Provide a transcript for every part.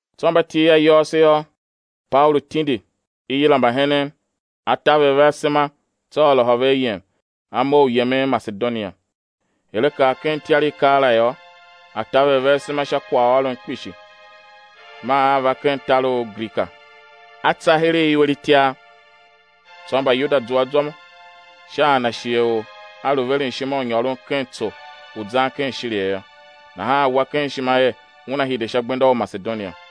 Tsô mba til ayôôso yô, Paulu tindi, i yila mbahenen, a taver ve asema, tsô a lôhô ve ayem, A mough u yemen Masedonia. Er a kar ken ityar i keela yô, a taver ve asema sha kwaghôron kpishi, maa a va ken tar u Grika. A tsa heregh iwer itiar. Tsô Mbayuda zua zwa sha a na shighe u a lu veren ishima u nyôron ken tso u zan ken Shiria yô, nahan a wa ken ishima er una hide sha gbenda u Masedonia.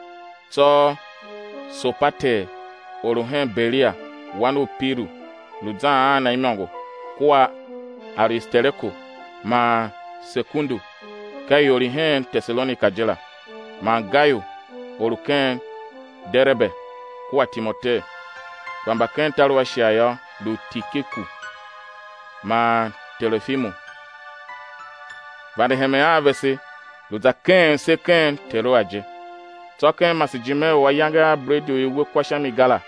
Tsô Sopater, or u hen Berea, wan u Piru, lu zan a na imôngo kua Aristareku man Sekundu, ka ior i hen Tesalonika je la; man Gayu, or u ken Derebe, kua Timoteu; kpa mba ken tar u Ashia yô, lu Tikiku man Terofimu, vande hemen a vese, lu za keghen se ken Teroa je. Tsô ken masejime u ayange a bredi u i we kwa sha mi ga la,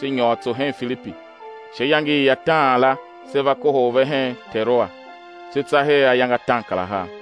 se nyôr tso hen Filipi, sha iyange i ataan la se va kohol ve hen Teroa, se tsa her ayange ataankarahar.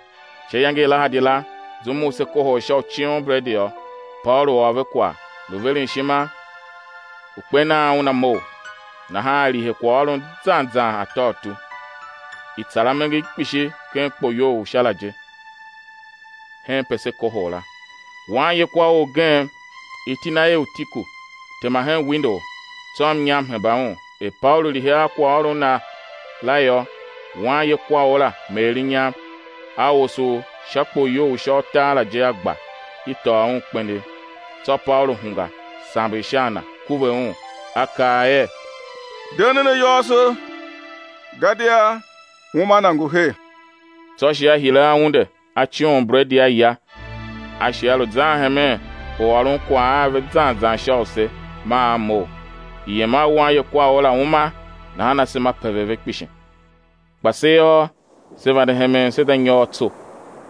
Sha iyange i lahadi la, zum u se kohol sha u coon bredi yô, Paulu ôr ve kwagh, lu veren ishima u kper nan una mough; nahan a lihe kwaghôron na zan zan atôutu. I tsar amenger kpishi ken kpoyou u sha la je, henpe se kohol la. Wanye kwaor ugen, iti na er Utiku, tema hen windou, tsô mnyam hemba un; er Paulu lihe a kwaghôron na la yô, wanye kwaor la meer mnyam, a osough sha kpoyou u sha utar la je, a gba, i tôô un kpenegh. Tsô Paulu hungwa, samber sha a na, kuve un, a kaa er: De nen ayôôso, gadia uma na ngu her. Tsô a shi a hire a unde, a coon bredi, a ya, a shi a lu zan hemen u ôron kwagh a ve zan zan sha use, maa a mough. I yem a wanye kwaor la uma; nahan asema pever ve kpishi. Kpa se yô, se vande hemen se za nyôr tso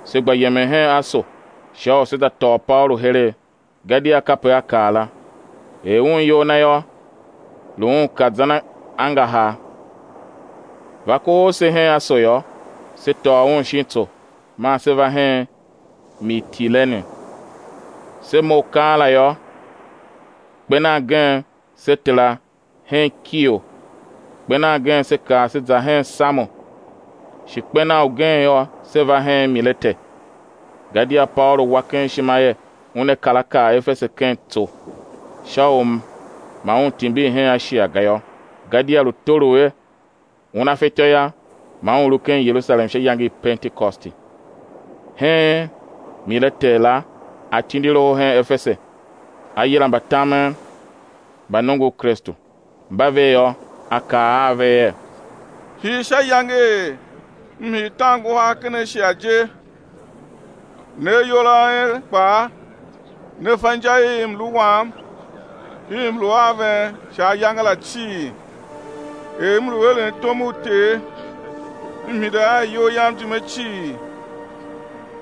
se gba yemen hen Aso sha u sé za tôô Paulu heregh; gadia kape a kaa la, er un iyol na yô, lu un ka zan angahar. Va kohol se hen Aso yô, se tôô un shin tso man se va hen Mitilene. Se mough keela yô, kper nan gen, se tera hen Kio; kper nan gen se kar se za hen Samo; shi kper nan ugen yô, se va hen Milete. Gadia Paulu wa ken ishima er una kar a kar Efese ken tso, sha u ma un timbir hen Ashia ga yô, gadia lu tolough er una fatyô yô, ma un lu ken Yerusalem sha iyange i Pentekosti. Hen Milete la a tindi loho hen Efese, a yila mbatamen mba nongo u Kristu. Mba ve yô, a kaa a ve er: Hii sha iyange i m hii tan nguhar ken Ashia je, ne ayol a en kpaa ne fa inja i mlu wam i m lu a ven sha ayange la cii, er m lu eren tom u Ter, m hide a iyol yam ijime cii,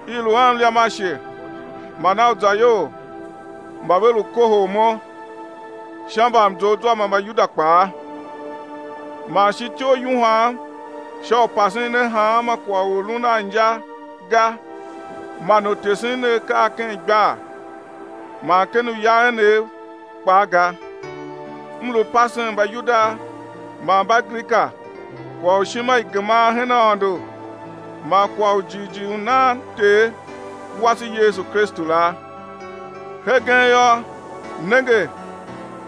i lu a mliam ashe man a uzayol mba ve lu kohol mo sha mbamzoughzwa mba Mbayuda kpaa; man shi ityough yuhwam sha u pasen ne hanma kwagh u lun a inja ga, man u tesen ne akaa ken igbar man ken uya enev kpaa ga, m lu pasen Mbayuda man Mbagrika kwagh u ishima i geman hen Aôndo man kwagh u jighjigh u nan Ter wase Yesu Kristu la. Hegen yô, nenge,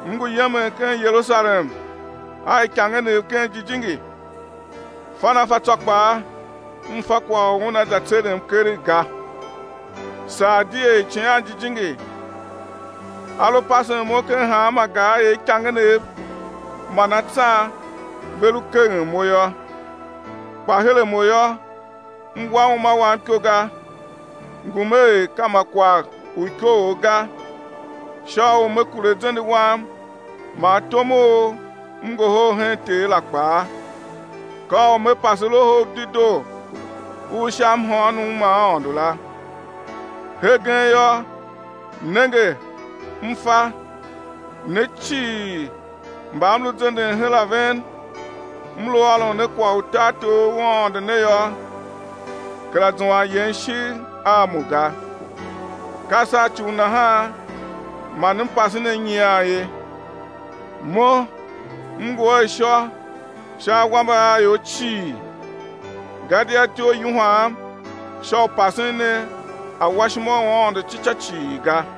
m ngu yemen hen Yerusalem a ikangenev ken Jijingi, fan a fa tsô kpaa, m fa kwagh u una za tserem keregh ga, saa di er Icighan Jijingi A lu pasen mo ken hanma gar er ikangenev man atsan ve lu keghen mo yô. Kpa her a mo yô, m wa uma wam iko ga, ngum er ka ma kwagh u ikoogh ga, sha u me kure zende wam man tom u m ngohol hen Ter la kpaa, ka u me pase Loho u Dedoo u sha mhôônom ma Aôndo la. Hegen yô, nenge, m fa, ne cii mba m lu zenden her a ven, m lu ôron ne kwagh u tartor u Aôndo ne yô, kera zuan yen ishigh a mo ga. Ka sha ci u nahan man m pase ne nyian ye, mo m ngu a ishô sha awambe a ior cii. Gadia ityough yuhwam sha u pasen ne awashima u Aôndo ci ca cii ga.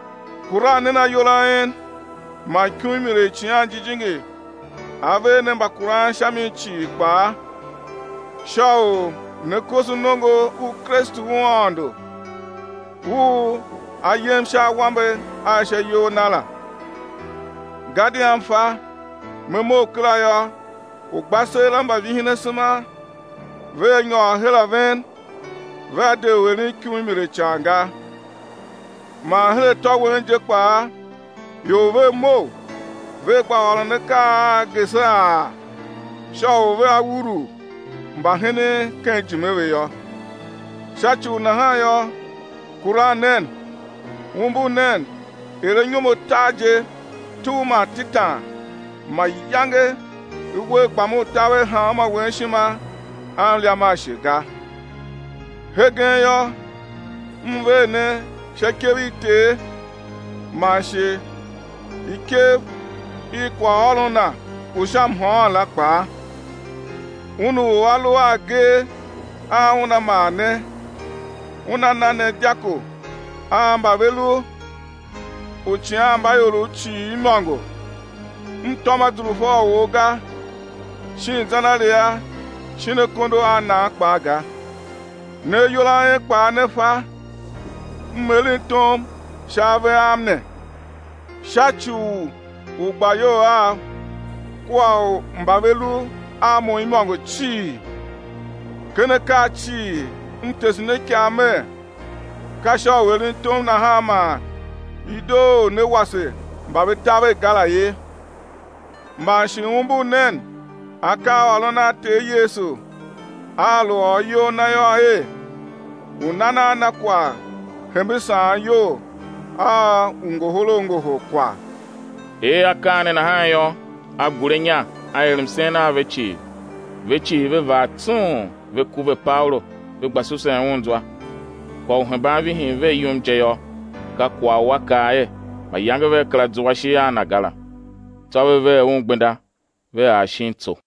Kuran nen ayol a en man ikumuile i Icighan Jijingi a ver ne mbakuran sha mi cii kpaa, sha u né koso nongo u Kristu u Aôndo, u A yem sha awambe a sha iyol Na la. Gadia m fa, me mough kera yô, ugbaseela mba vihin asema vea va nyôr her a ven, vea de u eren ikumuile ican ga. Man her atô wen je kpaa ior vea mough, vea gba ôron akaa a geseghaa, sha u vea urugh mbahenen ken ijime ve yô. Sha ci u nahan yô, kuran nen, umbur nen er anyom atar je tugh man tetan, mayange uwer gbam u taver hanmô wen ishima a mliam ashe ga. Hegen yô, m ver ne sha ikev i Ter man shi ikev i kwaghôron Na u sha mhôôn la kpaa, Un u A lu a agee a Una maa ne, Una na ne dyako a mba ve lu uicighanmbaiorov cii imôngo. M tôm azurfa u or ga, shin zenaria shin akondo a nan kpaa ga; ne ayol a en kpaa ne fa, m eren tom sha ave am ne, sha ci u ugbayol av kua u mba ve lu a mo imôngo cii. Ken akaa cii m tese ne ikav mer, ka sha u eren tom nahan man i doo u né wase mba ve taver ga la ye. Man shi umbur nen akaaôron a Ter Yesu A lu ôr iyol Na yô, er: U nan a na kwagh hembe saan iyol a u ngohol a ngohol kwagh. Er akaa ne nahan yô, a gure inya a er msen a ve cii. Ve cii ve vaa tsung, ve kuve Paulu, ve gba susen un zwa kwagh u hemban vihin ve yum je yô, ka kwagh u a kaa er, mayange vea kera zua ishigh a na ga la. Tsô ve ver un gbenda, ve ar shin tso.